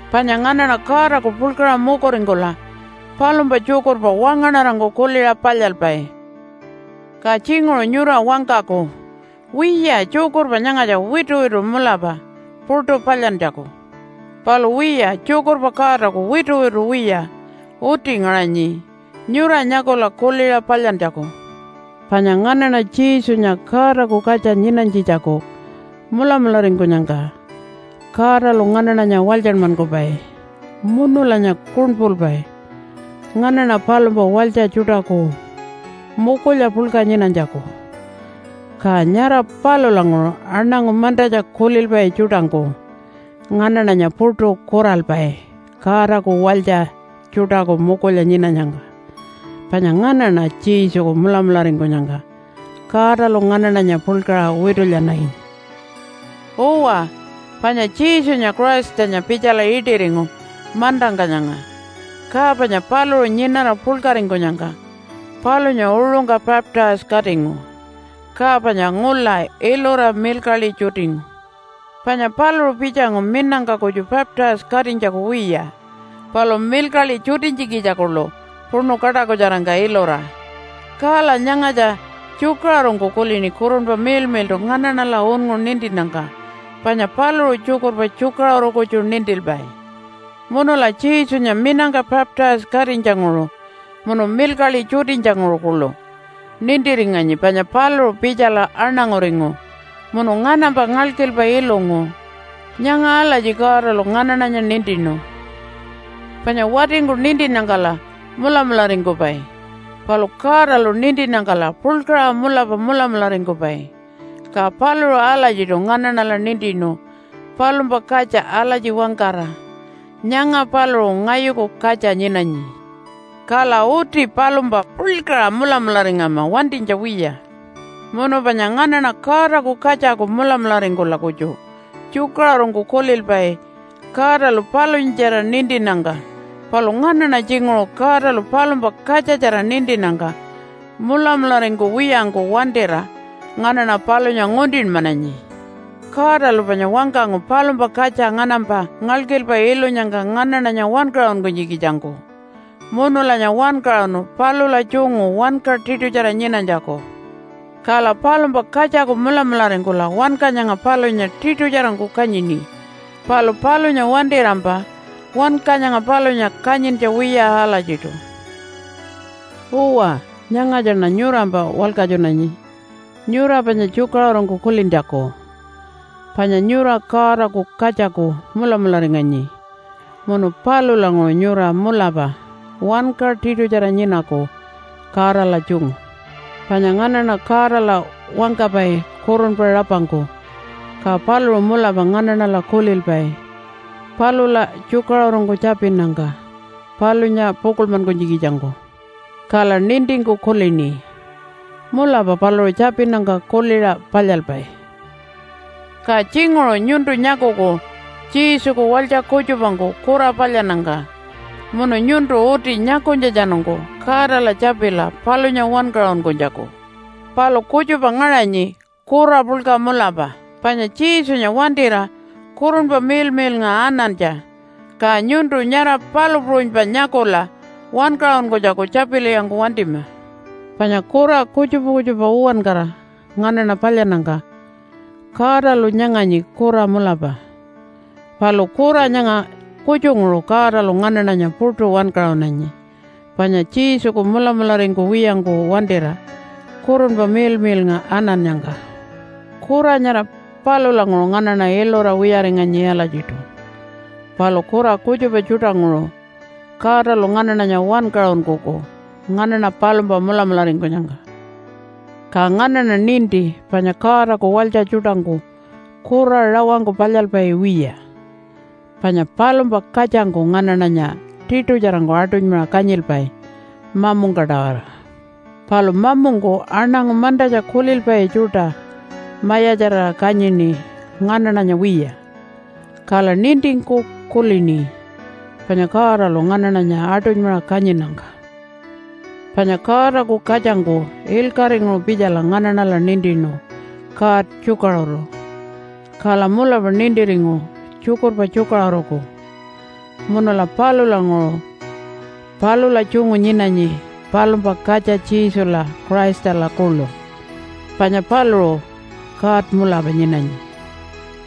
Panya nganaṉa Godaku puḻkaṟa mukuringkula palumpa tjukurpa wangaṉarangku kuliṟa palyalpai. Ka tjinguṟu nyura wangkaku, “Wiya tjukurpa nyangatja wituwitu mulapa puṯu palyantjaku.” Palu wiya tjukurpa Godaku wituwitu wiya uti ngaṟanyi nyura nyakula kuliṟa palyantjaku. Panya nganaṉa Jesunya Godaku katja nyinanytjitjaku mulamularingkunyangka Godalu nganaṉanya walytjanmankupai munulanya kuṉpulpai nganaṉa palumpa walytja tjuṯaku mukulya puḻka nyinanytjaku. Ka nyara palulanguṟu aṉangu mantatja kulilpai tjuṯangku nganaṉanya puṯu kuralpai Godaku walytja tjuṯaku mukulya nyinanyangka. Panya nganaṉa Jesuku mulamularingkunyangka Godalu nganaṉanya puḻkaṟa witulyananyi. Uwa, panya Jesunya Christanya pitjala iṯiringu mantangka nyanga, ka panya paluṟu nyinara puḻkaringkunyangka palunya uṟungka baptise-katingu. Ka panya ngula ilura milkaḻi tjutingu. Panya paluṟu pitjangu minangka kutju baptise-katinytjaku wiya, palu milkaḻi tjutinytjikitja kuḻu puṉu kaṯakutjarangka ilura. Kala nyangatja tjukaṟurungku kulini Kurunpa Miḻmiḻṯu nganaṉala unngu nintinnyangka, panya paluṟu tjukurpa tjukaṟuru kutju nintilpai. Munula Jesunya minangka baptise-katinytjanguṟu munu milkaḻi tjutinytjanguṟu kuḻu nintiringanyi panya paluṟu pitjala aṉanguringu munu nganampa ngalkilpa ilungu. Nyanga alatji Godalu nganaṉanya nintinu. Panya watingku nintinnyangkala mulamularingkupai. Palu Godalu nintinnyangkala puḻkaṟa mulapa mulamularingkupai. Ka paluṟu alatjiṯu nganaṉala nintinu palumpa katja alatji wangkara, “Nyanga paluṟu ngayuku katja nyinanyi.” Kala uti palumpa puḻkaṟa mulamularingama wantinytja wiya. Munu panya nganaṉa Godaku katjaku mulamularingkula kutju tjukaṟurungku kulilpai Godalu palunyatjara nintinnyangka. Palu nganaṉa tjinguṟu Godalu palumpa katjatjara nintinnyangka mulamularingkuwiyangku wantira nganaṉa palunya nguntinmananyi. Godalu panya wangkangu palumpa katja nganampa ngalkilpa ilunyangka nganaṉanya wankaṟunkunytjikitjangku. Munulanya wankaṟunu palula tjungu wanka tiṯutjara nyinanytjaku. Kala palumpa katjaku mulamularingkula wanka nyanga palunya tiṯutjarangku kanyini, palu palunya wantirampa wanka nyanga palunya kanyintja wiya alatjiṯu. Uwa, nyangatjaṉa nyurampa walkatjunanyi nyura panya tjukaṟurungku kulintjaku. Panya nyura Godaku katjaku mulamularinganyi munu palulanguṟu nyura mulapa wanka tiṯutjara nyinaku Godala tjungu. Panya nganaṉa Godala wangkapai kurunpa rapangku, ka paluṟu mulapa nganaṉala kulilpai palula tjukaṟurungku tjapinnyangka palunya pukuḻmankunytjikitjangku. Kala nintingku kulini, “Mulapa paluṟu tjapinnyangka kuliṟa palyalpai.” Ka tjinguṟu nyuntu nyakuku Jesuku walytja kutjupangku kura palyannyangka. Munu nyuntu uti nyakunytjatjanungku Godala tjapila palunya wankaṟunkunytjaku. Palu kutjupa ngaṟanyi kura puḻka mulapa, panya Jesunya wantira Kurunpa Miḻmiḻnga anantja. Ka nyuntu nyara palu puṟunypa nyakula wankaṟunkunytjaku tjapilwiyangku wantima. Panya kura kutjupa kutjupa uwankara nganaṉa palyannyangka Godalu nyanganyi kura mulapa. Palu kura nyanga kutjunguṟu Godalu nganaṉanya puṯu wankaṟunanyi, panya Jesuku mulamularingkuwiyangku wantira Kurunpa Miḻmiḻnga anannyangka. Kura nyara palulanguṟu nganaṉa ilura wiyaringanyi alatjiṯu. Palu kura kutjupa tjuṯanguṟu Godalu nganaṉanya wankaṟunkuku nganaṉa palumpa mulamularingkunyangka. Ka nganaṉa ninti panya Godaku walytja tjuṯangku kura rawangku palyalpai wiya. Panya palumpa katjangku nganaṉanya tiṯutjarangku aṯunymaṟa kanyilpai mamungka-tawara. Palu mamungku aṉangu mantatja kulilpai tjuṯa mayatjarira kanyini nganaṉanya wiya, kala nintingku kulini panya Godalu nganaṉanya aṯunymaṟa kanyinnyangka. Panya Godaku katjangku ilkaṟinguṟu pitjala nganaṉala nintinu God tjukaṟuru, kala mulapa nintiringu tjukurpa tjukaṟuruku. Munula palulanguṟu palula tjungu nyinanyi palumpa katja Jesula Christala kuḻu. Panya paluṟu God mulapa nyinanyi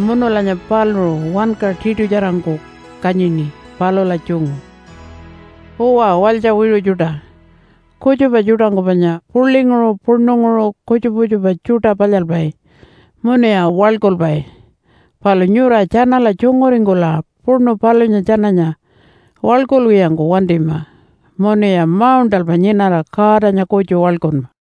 munulanya paluṟu wanka tiṯutjarangku kanyini palula tjungu. Uwa walytja wiṟu tjuṯa, kutjupa tjuṯangku panya puḻinguṟu puṉunguṟu kutjupa kutjupa tjuṯa palyalpai munuya waḻkulpai. Palu nyura tjanala tjunguringkula puṉu palunya tjananya waḻkulwiyangku wantima munuya mauṉṯalpa nyinara Godanya kutju waḻkunma.